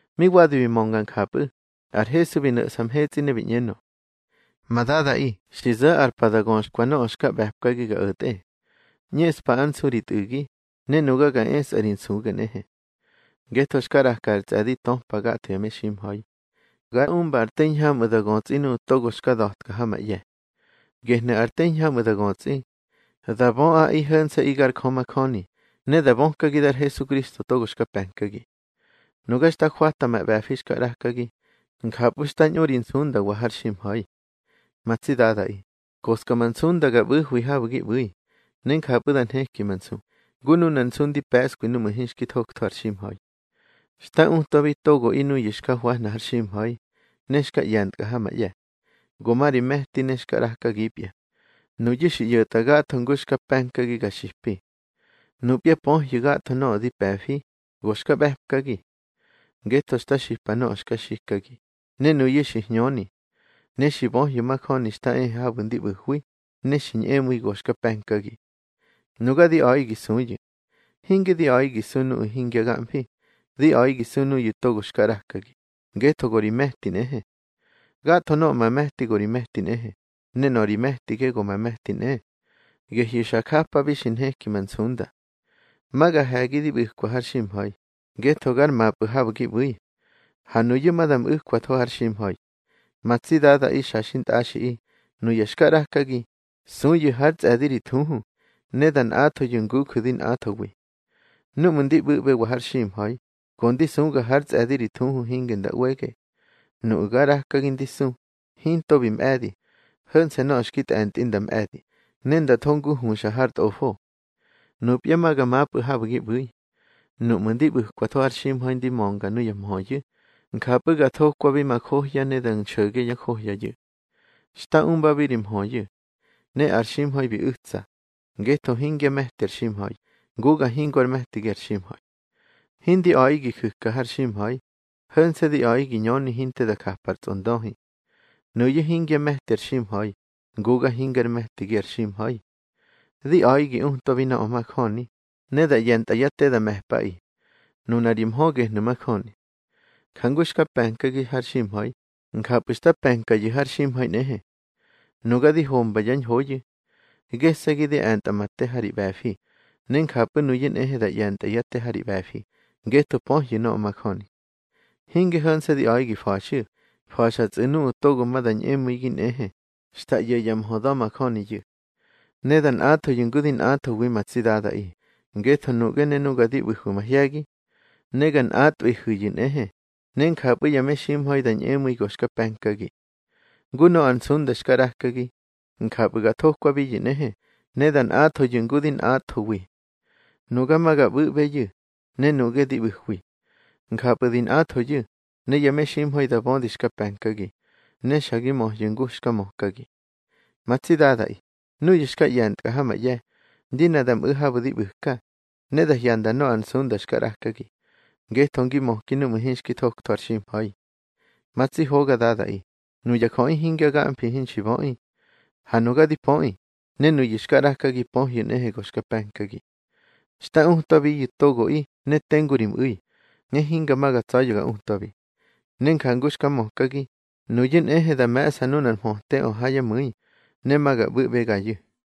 Mi wadi bi mönga njapꞌu̱, ar Hesu bi no̱ꞌsa mhetsꞌi ne bi ꞌñenö: —Ma Dadaꞌi, xi zo̱ ar pa da göxkwa nöꞌö xka ꞌbe̱pkagi ga o̱tꞌe. ꞌÑeꞌspa ár nsu ri Tꞌu̱gi, ne nuga ga esꞌa ri nsuge nꞌehe. Ngetho xka ꞌraka ar tsꞌe̱di töpa gatho ya meximha̱i, ga umba ar te hiñhamꞌu̱ da götsꞌi nuꞌu̱ togo xka da̱tka ha ma ꞌye̱. Gehnu̱ ar te hiñhamꞌu̱ da götsꞌi: da böꞌaꞌi ho̱nse̱ꞌi gar Jö majöni, ne da bökagi dar Hesukristo togo xka pe̱nkagi. Nuga xta jwata ma ꞌbe̱fi xka ꞌrakagi, njapꞌu̱ xta ñꞌu ri nsundawa har ximha̱i. Ma tsi Dadaꞌi, koska ma nsunda ga ꞌbu̱hwi habu̱ gi ꞌbu̱i, ne njapꞌu̱ da nheki ma nsu, ngu nunar nsu ndi pe̱ꞌskwi núꞌmu̱ hinxki thoktho ar ximha̱i. Xta utwabi togoꞌi nuyu̱ xka hwahna har ximha̱i, ne xka ꞌye̱ntkꞌa ha ma ꞌye̱. Go ma ri me̱ti ne xka ꞌrakagipya. Nuyu̱ xi ꞌyo̱tꞌa gatho ngu xka pe̱nkagi ga xipi. Nupya pöhyu̱, gatho nöꞌö di pe̱fi, go xka ꞌbe̱pkagi. Ngetho xta xipa nöꞌö xka xikagi, ne nuyu̱ xi hñöni. Ne xi böhyu̱ majöni xta ehe habu̱ ndi ꞌbu̱hwi, ne xi ñꞌemu̱i go xka pe̱nkagi. Nuga di a̱ꞌi gi suyu̱. Hinge di a̱ꞌi gi su nuꞌu̱ hingya gamfi, di a̱ꞌi gi su nuyu̱ togo xka ꞌrakagi, ngetho go ri me̱ti nꞌehe. Gatho nöꞌö ma me̱ti go ri me̱ti nꞌehe, ne nöꞌö ri me̱tige go ma me̱ti nꞌe. Gehyu̱ xa japabi xi nheki ma nsunda. Ma ga he̱gi di ꞌbu̱ka har ximha̱i, ngetho gar mapꞌu̱ habu̱ gi ꞌbu̱i. Ha nuyu̱ ma da mꞌu̱kwatho har ximha̱i. Ma tsi Dadaꞌi xa xintꞌaxiꞌi, nuya xka ꞌrakagi, suyu̱ hár tsꞌe̱di ri thuhu, ne da nꞌathoyu̱, nguju̱ di nꞌathowi. Núꞌmu̱ ndi ꞌbu̱ꞌbewa har ximha̱i, go ndi suga hár tsꞌe̱di ri thuhu hinge nda ꞌwege. Nuꞌu̱ ga ꞌrakagi ndi su, hinto bi mꞌe̱di, ho̱nse̱ nöꞌö xki tꞌe̱ntꞌi nda mꞌe̱di, ne nda tho ngu huxa har Tꞌofo. Nupya ma ga mapꞌu̱ habu̱ gi ꞌbu̱i. Núꞌmu̱ di ꞌbu̱kwatho har ximha̱i di mönga nuya mhöyu̱, njapꞌu̱ ga thokwabi ma johya ne da nxo̱ge yá johyayu̱. Xta umbabi ri mhöyu̱. Ne ar ximha̱i bi u̱tsa, ngetho hingyá me̱ti ar ximha̱i, nguga hingo ár me̱tigi ar ximha̱i. Hindi a̱ꞌi gi ju̱ka har ximha̱i, ho̱nse̱ di a̱ꞌi gi ñöni hinte da japa ar tsꞌondöhi. Nuyu̱ hingyá me̱ti ar ximha̱i, nguga hingar me̱tigi ar ximha̱i. Di a̱ꞌi gi utwabi nöꞌö majöni, ne da ꞌye̱ntꞌa yá te da me̱pꞌaꞌi. Nuna ri mhö gehnu̱ majöni. Jangu xka pe̱nkagi har ximha̱i, njapꞌu̱ xta pe̱nkayu̱ har ximha̱i nꞌehe. Nuga di homba yá ñhoyu̱. Gese̱gi di e̱ntꞌa ma te ha ri ꞌbe̱fi, ne njapꞌu̱ nuyu̱ nꞌehe da ꞌye̱ntyá te ha ri ꞌbe̱fi, ngetho pöhyu̱ nöꞌö majöni. Hinge ho̱nse̱ di a̱ꞌaꞌi gi fa̱xyu̱. Fa̱xatsꞌu̱ nuꞌu̱ togo ma da ñꞌemu̱igi nꞌehe xta ꞌyo̱ yá mhö da̱majöniyu̱. Ne da nꞌathoyu̱ ngu di nꞌathowi, ma tsi Dadaꞌi, ngetho nuꞌge ne nuga di ꞌbu̱hwi mahye̱gi. Ne ga nꞌatꞌwihu̱yu̱ nꞌehe, ne njapꞌu̱ ya meximha̱i da ñꞌemu̱i go xka pe̱nkagi. Ngu nöꞌö ar nsunda xka ꞌrakagi, njapꞌu̱ ga thokwabiyu̱ nꞌehe, ne da nꞌathoyu̱ ngu di nꞌathowi. Nuga ma ga ꞌbu̱ꞌbeyu̱, ne nuꞌge di ꞌbu̱hwi. Njapꞌu̱ di nꞌathoyu̱, ne ya meximha̱i da bödi xka pe̱nkagi, ne xa gi möhyu̱ ngu xka mökagi. Ma tsi Dadaꞌi, núyu̱ xka ꞌye̱ntkꞌa ha ma ꞌye̱, di ne da mꞌu̱ habu̱ di ꞌbu̱ka, ne da hyanda nöꞌö ar nsunda xka ꞌrakagi; ngetho ngi möki núꞌmu̱ hinxki thoktho ar ximha̱i. Ma tsi hoga Dadaꞌi, nuya jöꞌi hingya gamfi hinxi böꞌi. Ha nuga di pöꞌi, ne nuyu̱ xka ꞌrakagi pöhyu̱ nꞌehe go xka pe̱nkagi. Xta utwabiyu̱ togoꞌi ne tengu ri mꞌu̱i, ne hinga ma ga tsa̱ya̱ ga utwabi. Ne njangu xka mökagi, nuyu̱ nꞌehe da me̱ꞌsa nunar mhöteꞌö ha yá mu̱i, ne ma ga ꞌbu̱ꞌbegayu̱.